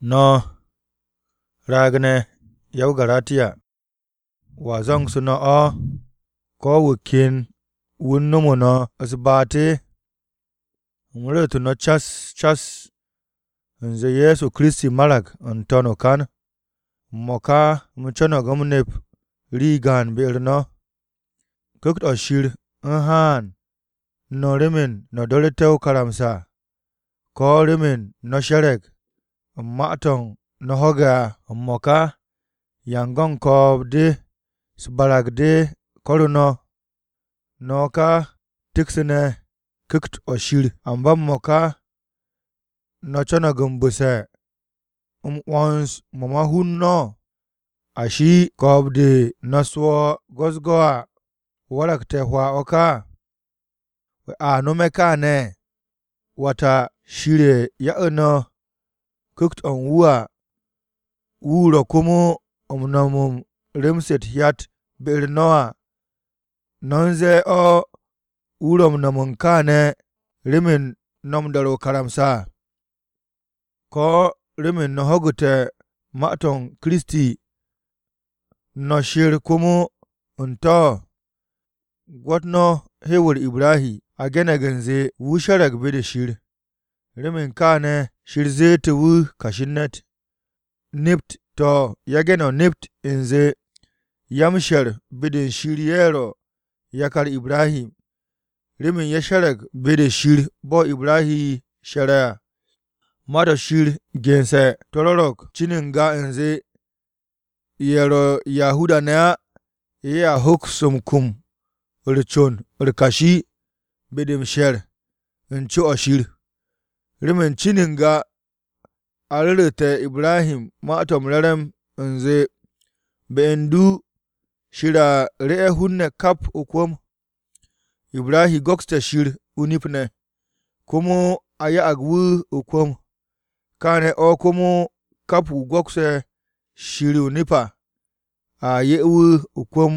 No̱ raag-ne̱ ya-o-Garatiya! ¿Wa zu̱ngsu̱ no̱ o̱? ¿Ko̱ wu̱ ken wu̱ u̱n nomo no̱ u̱s-baat? U̱m ru̱ru̱tu̱ no̱ cas cas u̱nze Ye̱so Kiristi marag n-to̱n o-kan. M-mo̱ka u̱m co̱no̱g u̱m nep rii gaan be-u̱r no̱. ¿Ku̱kt-o̱ Shir u̱n haan no̱ remen no̱ do̱ru̱te̱ o-karamsa, ko̱ remen no̱ she̱re̱g u̱n ma-to̱ no̱ ho̱ge̱ à? M-mo̱ka ¿yan-go̱n ko̱o̱b-de u̱s-barag de ko̱ru̱ no̱? No̱ ka teksu̱ne̱ u̱n Ku̱kt-o̱ Shir, amba m-mo̱ka ¿no̱ co̱no̱g m-bu̱se̱ u̱n 'wo̱ns-mo̱ u̱n ma-hun? ¿Ashe̱ ko̱o̱b-de no̱ swo̱o̱ go̱-u̱s-go̱ à, waragte̱ hwaa o̱ ka? ¿A nome̱ kaane̱? Wata, Shir ye̱ ya'u̱ no̱ Ku̱kt-o̱ u̱n wu̱ à, wu̱ ro̱ komo m-no̱m u̱n rem-se u̱t-hyat be-u̱r no̱ à. ¿No̱ u̱n zee o̱ wu̱ ro̱ m-no̱m kaane̱ remen no̱ m-do̱re̱ o-karamsa, ko̱ remen no̱ ho̱gu̱te̱ ma-u̱t Kiristi, no̱ sher komo u̱n to̱? Gwo̱t no̱ hew-u̱r Ibrahi. A ge̱ne̱g u̱nze, “Wu̱ she̱re̱g be-de Shir, remen kaane̱ Shir zette̱ wu̱ kashi u̱n ne̱t.” To̱, yage̱ no̱ nept u̱nze ya-m-she̱r be-de Shir ye̱ ro̱ “Yakar Ibrahi” remen ye̱ she̱re̱g be-de Shir bo̱ Ibrahi she̱r à. Ma-to̱ Shir gense̱, to̱ rwo̱ro̱g cin n-ga u̱nze, ye̱ ro̱ Yahuda-ne̱ á ye̱a hoks m-kum u̱r-con u̱r-kashi be-de m-she̱r u̱n co-o̱ Shir. Remen cin n-ga a ru̱ru̱te̱ IbrahiMa-to̱ m-Re̱re̱m u̱nze, “Be u̱n du, Shir a ru̱'e̱ hun-ne̱ kap o-kwu̱m.” Ibrahi go̱kste̱ Shir o-nip ne̱, komo a ya'ag wu̱ o-kwu̱m. Kaane̱ o̱ komo kap wu̱ go̱kse̱ Shir o-nip à, a 'ye wu̱ o-kwu̱m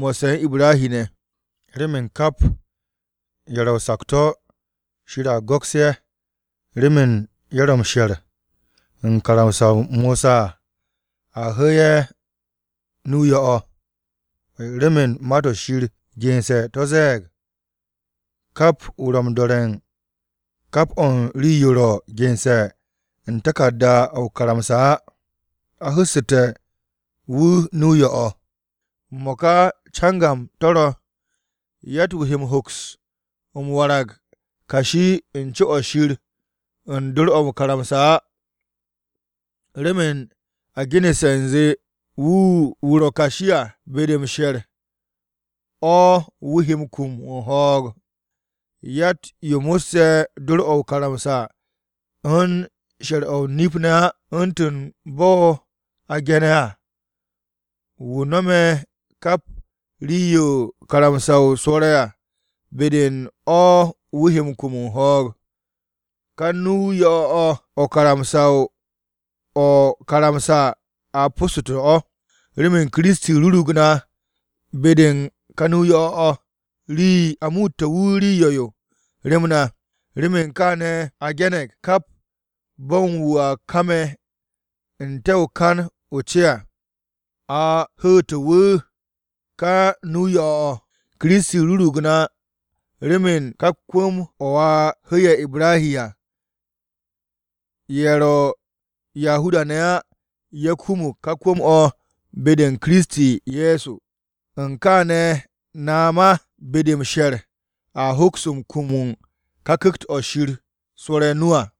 mo̱sse̱ u̱n Ibrahi ne̱. Remen kap ye̱ ro̱ o-sakto̱ Shir a go̱ks ye̱ remen ye̱ ro̱ m-she̱r u̱n karamsa-o Mosa à, a hu̱u̱ ye̱ nu-o yo̱-o̱. Remen Ma-to̱ Shir gense̱ to̱ ze̱e̱g, “Kap wu̱ m-do̱re̱ u̱n kap o̱ u̱n rii-yo ro̱ gense̱ u̱n taku̱rda-o̱ o-karamsa á, a hu̱su̱te̱ wu̱ nu-o yo̱-o̱.” M-mo̱ka cangam to̱ ro̱, yatt-wu̱ he m-hoks m-warag kashi u̱n co̱-o̱ Shir u̱n dor-o̱ o-karamsa á, remen a genesse̱ u̱nze, “Wu̱ ro̱ kashi à, be-de m-she̱r o̱ wu̱ he kum u̱n ho̱o̱g.” Yatt-yo mo̱sse̱ dor-o̱ o-karamsa u̱n she̱r o-nip ne̱ á, u̱ntu̱n bo̱ a ge̱ne̱ à, “Wu̱ nome̱ kap rii-yo karamsa-o rwo̱re̱ à, be-de u̱n o̱ wu̱ he kum m-ho̱o̱g.” Ka nu-o yo̱-o̱ o̱, o̱ o-karamsa a possu̱ssu̱te̱ o̱, remen Kiristi rurug na be-de u̱n ka nu-o yo̱-o̱ o̱, remen a muute̱ wu̱ rii-yo yo̱, rem na. Remen kaane̱ a ge̱ne̱g, “Kap bo̱n wu̱ a kame̱ n-te̱ u̱n kan-o̱ o-ce à, a hu̱u̱tu̱ wu̱ o̱ ka nu-o yo̱-o̱.” Kiristi rurug na remen ka kwu̱m-o̱ a hu̱'e̱ Ibrahi à, ye̱ ro̱ Yahuda-ne̱ á ye̱ kumut ka kwu̱m-o̱ be-u̱r Kiristi Ye̱so. U̱n kaane̱, na ma, be-de m-she̱r, a hoks m-kum u̱n ka Ku̱kt-o̱ Shir swo̱re̱ o-nu à.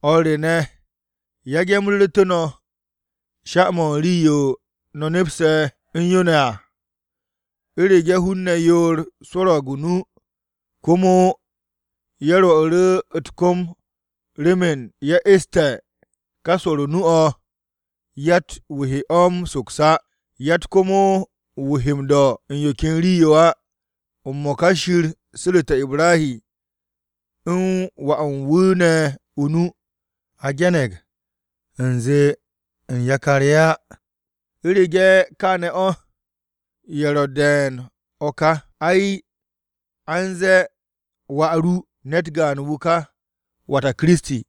O̱r re ne̱, yage̱ u̱m ruutu̱ru̱ no̱ sha-mo̱ u̱n rii-yo no̱ nepse̱ u̱n yo ne̱ à. U̱rege̱ hun-ne̱ yoor swo̱ro̱g o-nu komo ye̱ rwo̱'u̱ru̱ u̱t-kom remen ye̱ e̱sté̱ ka swo̱o̱ru̱ nu-o̱ yatt-wu̱ he o̱ m-soks á, yatt komo wu̱ he m-do̱ u̱n yo ken rii-yo á. M-mo̱ka Shir su̱ru̱te̱ Ibrahi u̱n wà u̱n wu̱ ne̱ o-nu. A ge̱ne̱g u̱nze, u̱n “Yakar-ye̱” á. U̱rege̱ kaane̱ o̱, ye̱ ro̱ de̱e̱n o̱ ka. Ay, a u̱n ze̱e̱, “Wà ru,” ne̱t gaan wu̱ ka, wata Kiristi.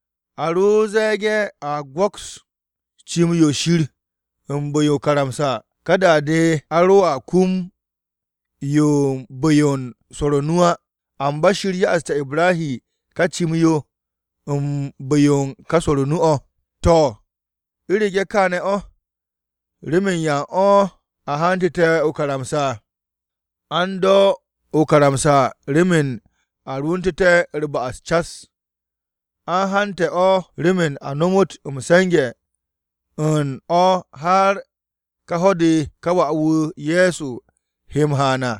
A ro ze̱e̱ge̱ a go̱ks cim-yo Shir u̱n bu̱-yo o-karamsa, ka da-de a roa kum yo u̱n bu̱-yo u̱n swo̱r o-nu á. Amba Shir ya'aste̱ Ibrahi ka cim-yo u̱n bu̱-yo u̱n ka swo̱r o-nu o̱. To̱ u̱rege̱ kááne̱ o̱, ¿remen yan o̱ a hantu̱te̱ o-karamsa? A u̱n do̱ o-karamsa remen a rwu̱ntu̱te̱ u̱r-ba'as cas. A u̱n hante̱ o̱ remen a nomot m-se̱nge̱ u̱n o̱ har ka ho̱-de ka wà-wu̱ Ye̱so he m-haan à.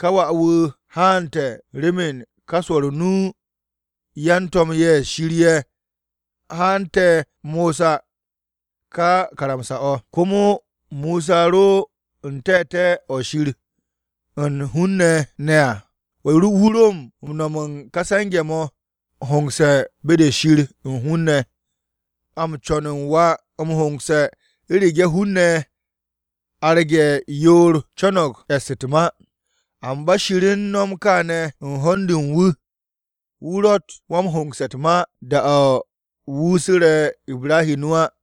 Ká wà-wu̱ haante̱ remen ká swo̱r o-nu o̱. Yan-to̱m-ye̱ Shir ye̱ hante̱ Mosa ká karamsa-o̱. Komo Mosa wu̱ ro n-te̱te̱ o̱ Shir u̱n hun-ne̱ ne̱ à, wu̱ ro m-no̱m ka se̱nge̱-mo̱ m-hongse̱ be-de u̱n Shir u̱n hun-ne̱ ne̱. A m-co̱n u̱n wa-m-hongse̱ u̱rege̱ hun-ne̱ arge̱ yoor co̱no̱g e̱sse̱ u̱t-ma. Amba Shir u̱n no̱m kaane̱ u̱n ho̱n-de u̱n wu̱. Wu̱ ro̱tt wa-m-hongse̱ u̱t-ma da-o̱ wu̱ su̱re̱ Ibrahi nu á.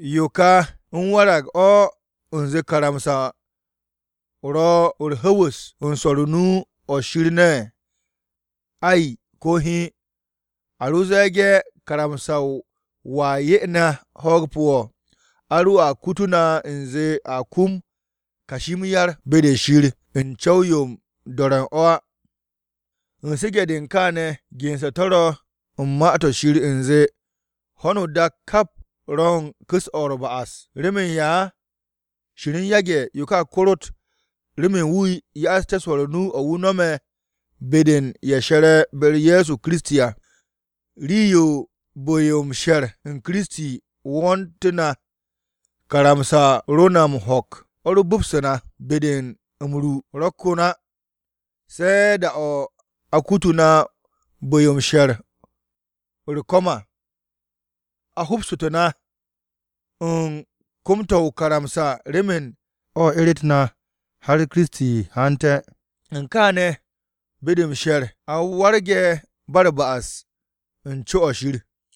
¿Yo ka u̱n warag o̱ u̱nze karamsa-o ro̱ u̱r-hwu̱'u̱s u̱n swo̱r o-nu o̱ Shir ne̱? Ay, ko̱ hiin! A ro ze̱e̱ge̱ karamsa-o wa 'ye na ho̱o̱g pu̱-o̱, a roa kutu na u̱nze a kum kashi m-yar be-de Shir u̱n co̱w-yo u̱n do̱re̱ o̱. U̱n su̱ge̱-de u̱n kaane̱, gense̱ to̱ ro̱ u̱n Ma-to̱ Shir u̱nze, ho̱no o-dak kap ro̱ u̱n ku̱s-o̱ u̱r-ba'as. ¿Remen ya? Shir u̱n yage̱ yo ka korot remen wu̱ ya'asté̱ swo̱o̱ru̱ nu-o̱ wu̱ no̱me̱, be-de ye̱ she̱re̱ be-u̱r Ye̱so Kiristi à. Rii-yo bu̱-yo m-she̱r u̱n Kiristi wo̱o̱ntu̱ na, karamsa-o̱ ro na m-ho̱k, o̱ ro bo̱bse̱ na be-de m-ru ro̱ ko̱n á se̱ da-o̱ a kutu̱ na bu̱-yo m-she̱r u̱r-ko̱m à. A bo̱bsu̱tu̱ na u̱n kom-to̱ o-karamsa remen o̱ eret na har Kiristi haante̱. U̱n kaane̱, be-de m-she̱r a warge̱ ba u̱r-ba'as u̱n co-o̱ Shir.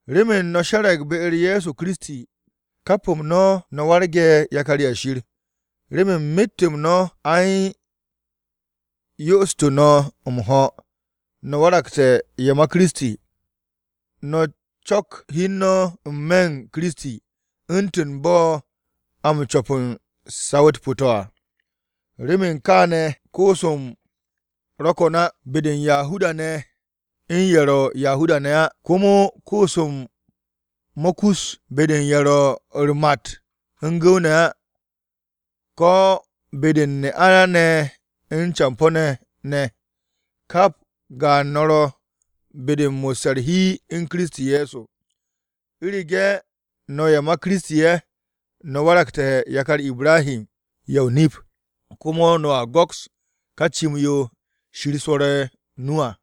Remen no̱ she̱re̱g be-u̱r Ye̱so Kiristi, kap-m no̱ no̱ warge̱ yakar-ye̱ Shir. Remen myet-m no̱ a u̱n yo'ostu̱ no̱ m-ho̱ no̱ waragte̱ ye̱ ma Kiristi, no̱ co̱k hi u̱n no̱ n-me̱ u̱n Kiristi, u̱ntu̱n bo̱ a m-co̱p u̱n saw-u̱t pu̱-to̱ à. Remen kaane̱ koos-m ro̱ ko̱n á be-de u̱n Yahuda-ne̱ u̱n ye̱ ro̱ Yahuda-ne̱ ne̱ á. Komo koos-m mo̱ kus be-de ye̱ ro̱ u̱r-mat u̱n gu̱w-ne̱ ne̱ á, ko̱ be-de u̱n ne'a-ne̱ u̱n campo̱-ne̱ ne̱. Kap gaan no̱ ro̱ be-de u̱n mo̱sse̱ u̱r-hi u̱n Kiristi Ye̱so. U̱rege̱ no̱ ye̱ ma Kiristi ye̱, no̱ waragte̱ yakar Ibrahi ye̱ o-nip, komo no̱a go̱ks ka cim-yo Shir swo̱re̱ o-nu à.